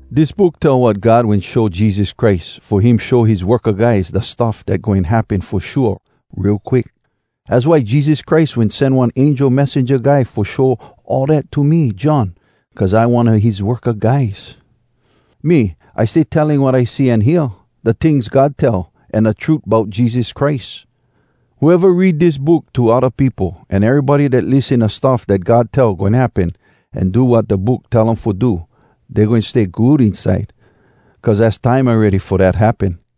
Dis book tell wat God wen show Jesus Christ fo him show his worka guys da stuff dat goin happen fo shua real quick. Az why Jesus Christ wen sen one angel messenja guy fo show all dat to me, John, cuz I one a his worka guys. Me, I stay telling wat I see an hear—da tings God tell, an da trut bout Jesus Christ. Whoeva read dis book to odda peopo, an erybody dat lissen da stuff dat God tell goin happen, an do wat da book tell um fo do, dey goin stay good inside, cuz az time awready fo dat happen.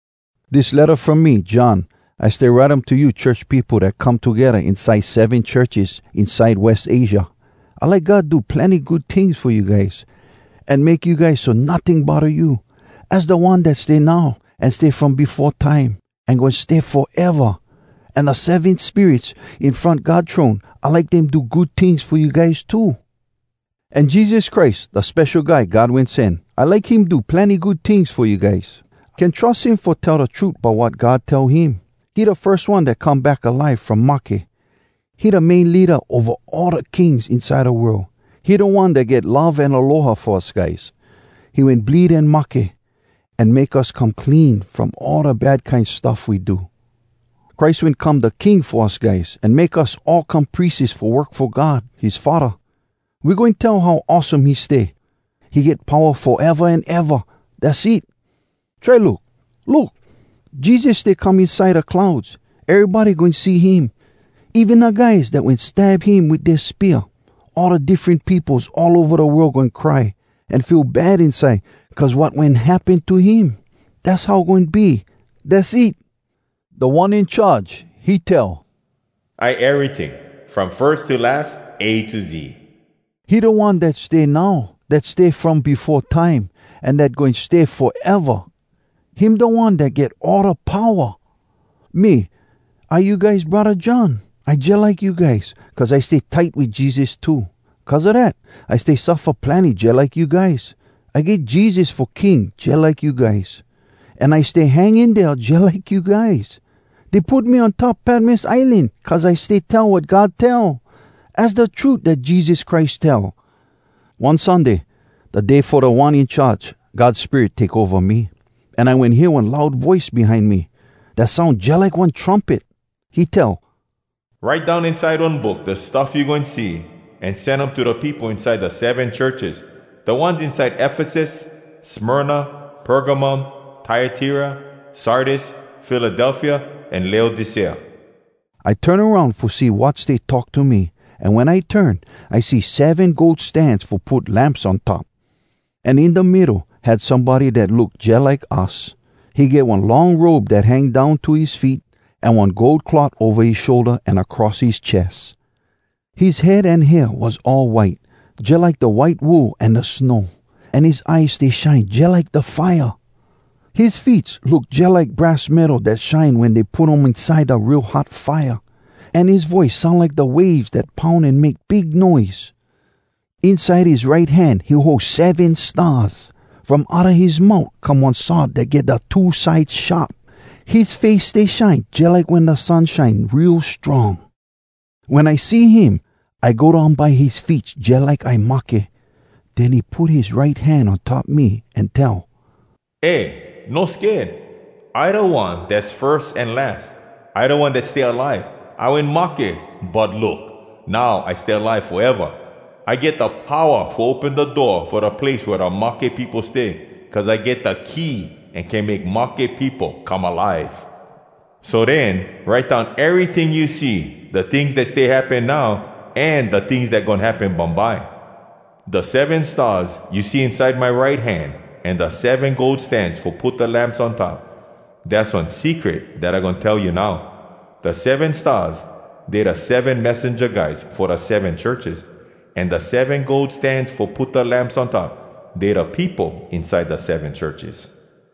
Dis letta from me, John. I stay write um to you church peopo dat come togedda inside seven churches inside West Asia. I like God do plenny good tings fo you guys, an make you guys so notting bodda you. Az da One dat stay now, an stay from befo time, an goin stay foeva! An da seven spirits in front God throne, I like dem do good tings fo you guys too. An Jesus Christ, da Spesho Guy God Wen Sen, I like him do plenny good tings fo you guys. Can trus him fo tell da trut bout wat God tell him. He da firs One dat come back alive from mahke. He da main leada ova all da kings inside da world. He da One dat get love an aloha fo us guys. He wen bleed an mahke, An make us come clean From all da bad kine stuff we do. Christ wen come da king fo us guys, An make us all come prieses Fo work fo God, his Faddah. We goin tell how awesome he stay. He get powa foeva an eva! Dass it! Try look! Look! Jesus stay come inside da clouds! Erybody goin see him, Even da guys dat wen stab him wit dea spear. All da diffren peopos all ova da world goin cry An feel bad inside cuz wat wen happen to him. Dass how goin be! Dass it! Da One In Charge, he tell, “I eryting, from firs to las, A to Z.” He da One dat stay now, dat stay from befo time, an dat goin stay foeva! Him da One dat get all da powa! Me, I you guys braddah John. I jalike you guys, cuz I stay tight wit Jesus too. Cuz a dat, I stay suffa plenny jalike you guys. I get Jesus fo king jalike you guys. An I stay hang in dea jalike you guys. Dey put me on top Patmos Islan cuz I stay tell wat God tell, az da trut dat Jesus Christ tell. One Sunday, da day fo Da One In Charge, God Spirit take ova me. An I wen hear one loud voice behind me, dat soun jalike one trumpet. He tell, “Write down inside one book da stuff you goin see, an sen um to da peopo inside da seven churches, da ones inside Efesus, Smyrna, Pergamum, Tyatira, Sardis, Philadelphia, an Laodicea.” I turn aroun fo see dat stay talk to me, an wen I turn, I see seven gold stans fo put lamps on top. An in da middo, had somebody dat look jalike us. He get one long robe dat hang down to his feet, an one gold cloth ova his shoulda an across his ches. His head an hair was all white, jalike da white wool an da snow, an his eyes stay shine jalike da fire. His feets look jalike brass metal dat shine wen dey put um inside da real hot fire, an his voice soun like da waves dat poun an make big noise. Inside his right hand, he hold seven stars! From outa his mout, come one sword dat get da two side sharp! His face stay shine, jalike wen da sun shine real strong! Wen I see him, I go down by his feets jalike I mahke. Den he put his right hand on top me an tell, “Eh, no sked! I da One dass firs an las. I da One dat stay alive! I wen mahke, but look! Now I stay alive foeva! I get da powa fo open da door fo da place wea da mahke peopo stay, cuz I get da key an can make mahke peopo come alive! “So den, write down eryting you see—da tings dat stay happen now, an da tings dat goin happen bumbye. Da seven stars you see inside my right hand, an da seven gold stans fo put da lamps on top, dass one secret dat I goin tell you now. Da seven stars, dey da seven messenja guys fo da seven churches. An da seven gold stans fo put da lamps on top, dey da peopo inside da seven churches.”